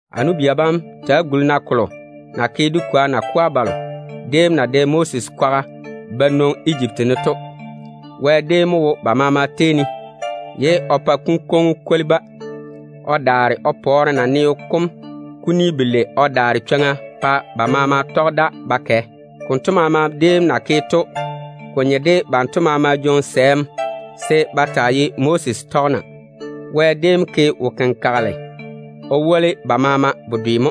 A nu-bia bam, ta‑á guli-na kolo na ke dé kwoa nakwa balo déem na dɛ Moses kwaga ba nwoŋi Ejipti ne to. Wɛ déem mo wo ba maama tei ne, ye o pa kunkwoŋo kom kwoli-ba. O ta ma pɔɔre naneo kom kuni belei o daare chwoŋa pa ba maama tɔge da ba kɛ. Konto maama déem na ke to, ko nye de banto maama jwoŋi sɛɛm se ba taa ye Moses tɔgena. Wɛ déem ke wo-kenkagela o woli ba maama bedwe mo.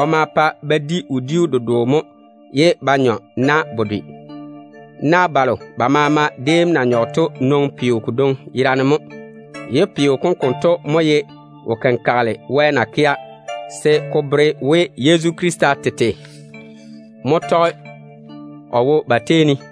O ma pa ba di wodiu dedoo mo, ye ba nyɔ na bedwe. Na balo ba maama déem na nyɔge to nwoŋi peo kodwoŋi yera mo, ye peo kom konto mo ye wo-kenkagele Wɛ na kea se ko bere we, Yezu Krista tete mo tɔge o wo ba tei ne.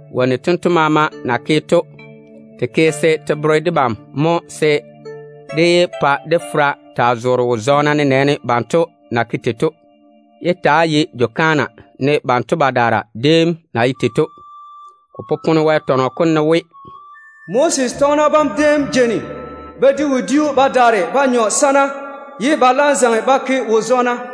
Wonnu tento maama na ke to, te ke se te bere debam mo se dé yé pa dé fera taa zoore wo-zɔɔna, nenɛɛne banto na ke tei to. Yé ta‑á ye jwo-kaana ne banto badaara déem na ye tei to. Ko popone Wɛ tɔnɔ kom ne we, “Nɔɔna bam déem lɛɛre ba di wodi-fɔrɔ mo ye ba nyɔa, ba daare ba zaŋe ba kwɛɛre yɔɔ yɔɔ.”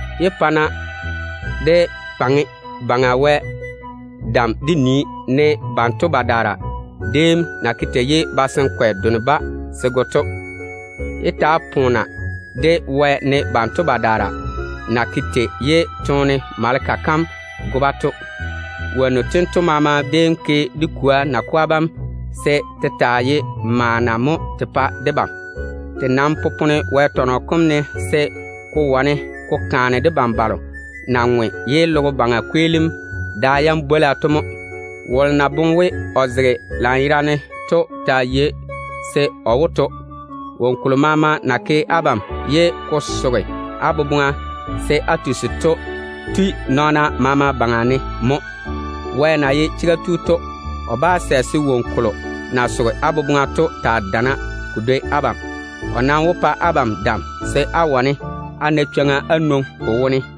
Yé pa-na dé faŋe Baŋa Wɛ dam dé nii, ne banto badaara déem na ke tei ye basankwe done-ba se go to. Yé ta‑á poona-na de Wɛ, ne banto badaara na ke tei ye toone maleka kam go-ba to. Wonnu tento maama déem ke dé kwoa nakwa bam se te taa ye maana mo te pa debam. Te nam popone Wɛ tɔnɔ kom ne se ko wane ko kaane debam balo ta na ŋwe ye logo baŋa kweelim da yam bwola to mo. Wolo na boŋe we o zege lanyerane to taa yei, se o wó to. Woŋo kolo maama na ke abam ye ko soge á boboŋa se á tusi to tui nɔɔna maama baŋa mo. Wɛ na ye chega tu to, o bá sɛ se woŋo kolo na soge á boboŋa to taa dana ko dwoi á jaanem. O nam wó pa abam dam se á wane á zege ye á daare á na chwoŋa á nwoŋi ko wone.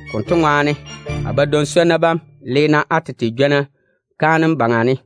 Konto ŋwaane, a badwoŋ-swonnu bam, le-na á tete jwona kaanem wone.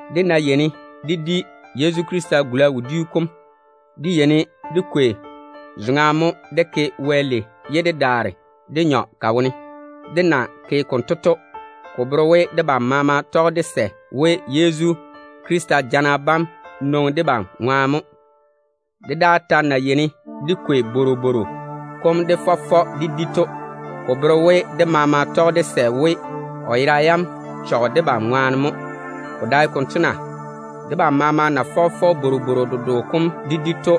Dé ná yeini de di Yezu Krista gula wodiu kom, dé yeini dé kwei zoŋa mo dé ke Wɛ lei, ye dé daare dé nyɔ ka wone. Dé na ke konto to, ko bere we debam maama tɔge dé sɛ we, Yezu Krista jana bam nwoŋi debam ŋwaane mo. Dé daa ta na yeini dé kwei bworobworo kom dé fɔ fɔ dé di to, ko bere we debam maama tɔge de sɛ we, o yera yam chɔge debam ŋwaane mo. Ko dae konto na? Debam maama na fɔge fɔge bworobworo dedoo kom dé di to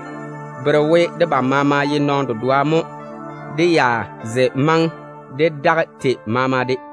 bere we debam maama ye nɔɔno dedoa mo, dé ya ze maŋe dé daga tei maama de.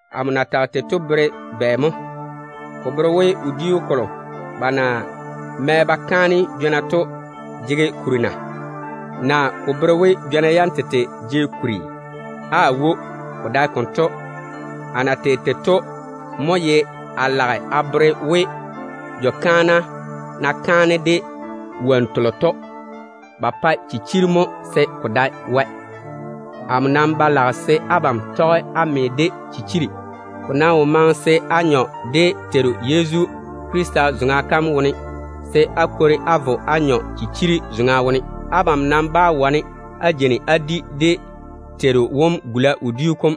Amo na tage tei to bere bɛ mo? Ko bere we wodiu kolo ba na mɛ ba kaane jwona to jege kuri mo na? Ko bere we jwona yam tete jege kuri mo na? Aawo, ko dae konto. A na tage tei to mo ye a lage a bere we, jwo-kaana na kwei wonnu telo ba ma ba ke kaanem to, ba kwei ba pae chichiri mo se ko dae Wɛ. Amo nam ba lage se abam tɔge á me de chichiri. Ko wo maŋe se á nyɔ dé Teiru Yezu Krista zoŋa kam wone, se á daare á vo á nyɔ chichiri zoŋa wone. Abam nam bá wane á jeini á di dé Teiru wom gula wodiu kom,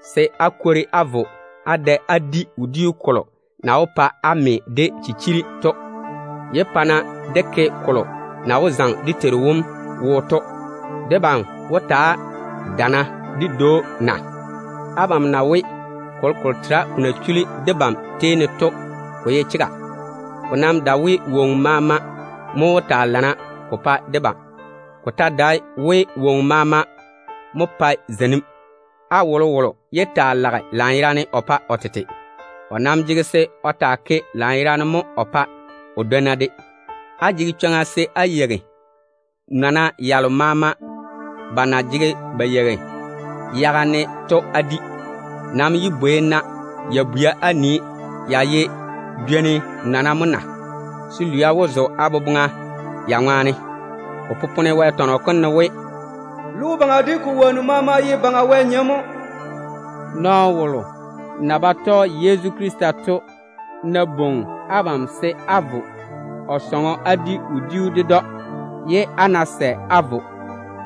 ye á daare á vo á da á di wodiu kolo na wó pa á me de chichiri to. Yé pa-na dé ke kolo na wó zaŋe dé Teiru wom wo to. Debam wó taa dana dé dwoi‑o na? Abam na we, kolokolo tera ko na chula debam tei ne to, ko ye chega. Ko nam dae we, woŋo maama mo jege nyɔɔre ko pa debam. Ko ta dae we, woŋo maama mo pae zeinim. Á wolowolo yé taa lage lanyerane o pa o tete. O nam jege se o taa lage lanyerane mo o pa o dwonna de. Á jege chwoŋa se á yeigi nɔna yalo maama ba na jege ba yeigi yaga ne to á di. Nam yé bwei-na ya bwia á nii, ya ye jwoni nɔna mo na, se lwia wó zo á boboŋa ya ŋwaane. Ko popone Wɛ tɔnɔ kom ne we, “Logo baŋa de ko wonnu maama ye Baŋa Wɛ nyem mo.” Nɔɔno wolo na ba tɔge Yezu Krista to ná bwoŋi nmo se n vo o sɔŋɔ n di wodiu ded‑o, ye n ná sɛ n vo,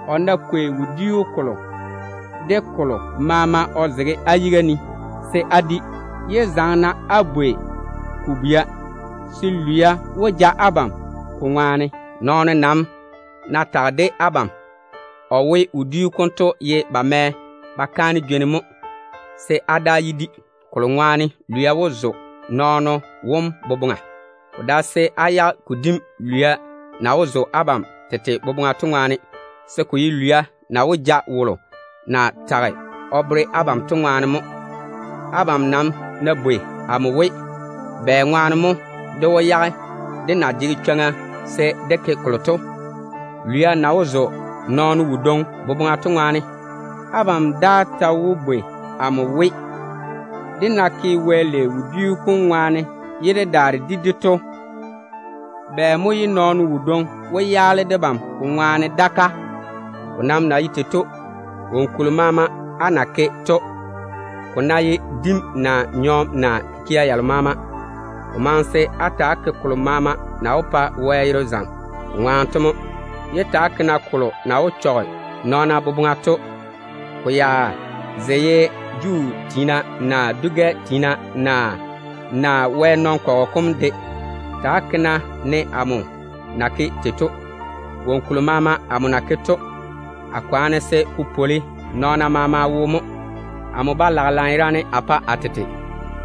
o ná kwei wodiu kolo de kolo maama o zege n yiga ne, se n di. Yé zaŋe n bwei ko bwia, se lwia wó zo n boboŋa ko ŋwaane. Nɔɔno nam ná tage de nmo o we, wodiu konto ye ba mɛ ba kaane jwoni mo, se n daa yé di, kolo ŋwaane lwia wó zo nɔɔno wom boboŋa. Ko dae se n yage ko dim lwia na wó zo nmo tete boboŋa to ŋwaane, se ko ye lwia na wó ja nɔɔno wodwoŋi wom to ŋwaane mo. Abam wó wane á bwei amo we, bɛŋwaane mo dé wó yage dé na jege chwoŋa se dé ke kolo to, lwia na wó zo nɔɔno wodwoŋi boboŋa to ŋwaane? Abam ta wó bwei amo we, dé na ke Wɛ lei wodiu kom ŋwaane ye dé daare dé di to, bɛ mo ye nɔɔno wodwoŋi daa wó yaale debam ko ŋwaane? Ko nam na ye tei to, woŋo kolo maama á na ke to, ko ná ye dim naa nyɔɔm naa kikia yalo maama, ko maŋe se á ta‑á ke kolo maama na wó pa Wɛ yere zaŋe wɛɛne ko ŋwaane to mo. Yé ta‑á ke-na kolo na wó chɔge nɔɔna boboŋa to, ko ya ze ye Juu tiina, naa dwi-gɛ tiina, naa Wɛ nɔn-kɔgɔ kom nɔɔna de. Ta‑á ke-na ne amo na ke tei to. Woŋo kolo maama amo na ke to, a kwaane se ko taa pwoli nɔɔna maama wo mo. Amo ba lage lanyerane a pa a tete.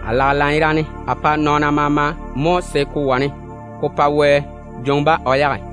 A lage lanyerane a pa nɔɔna maama mo, se ko wane ko pa Wɛ jwoŋi-ba o yage.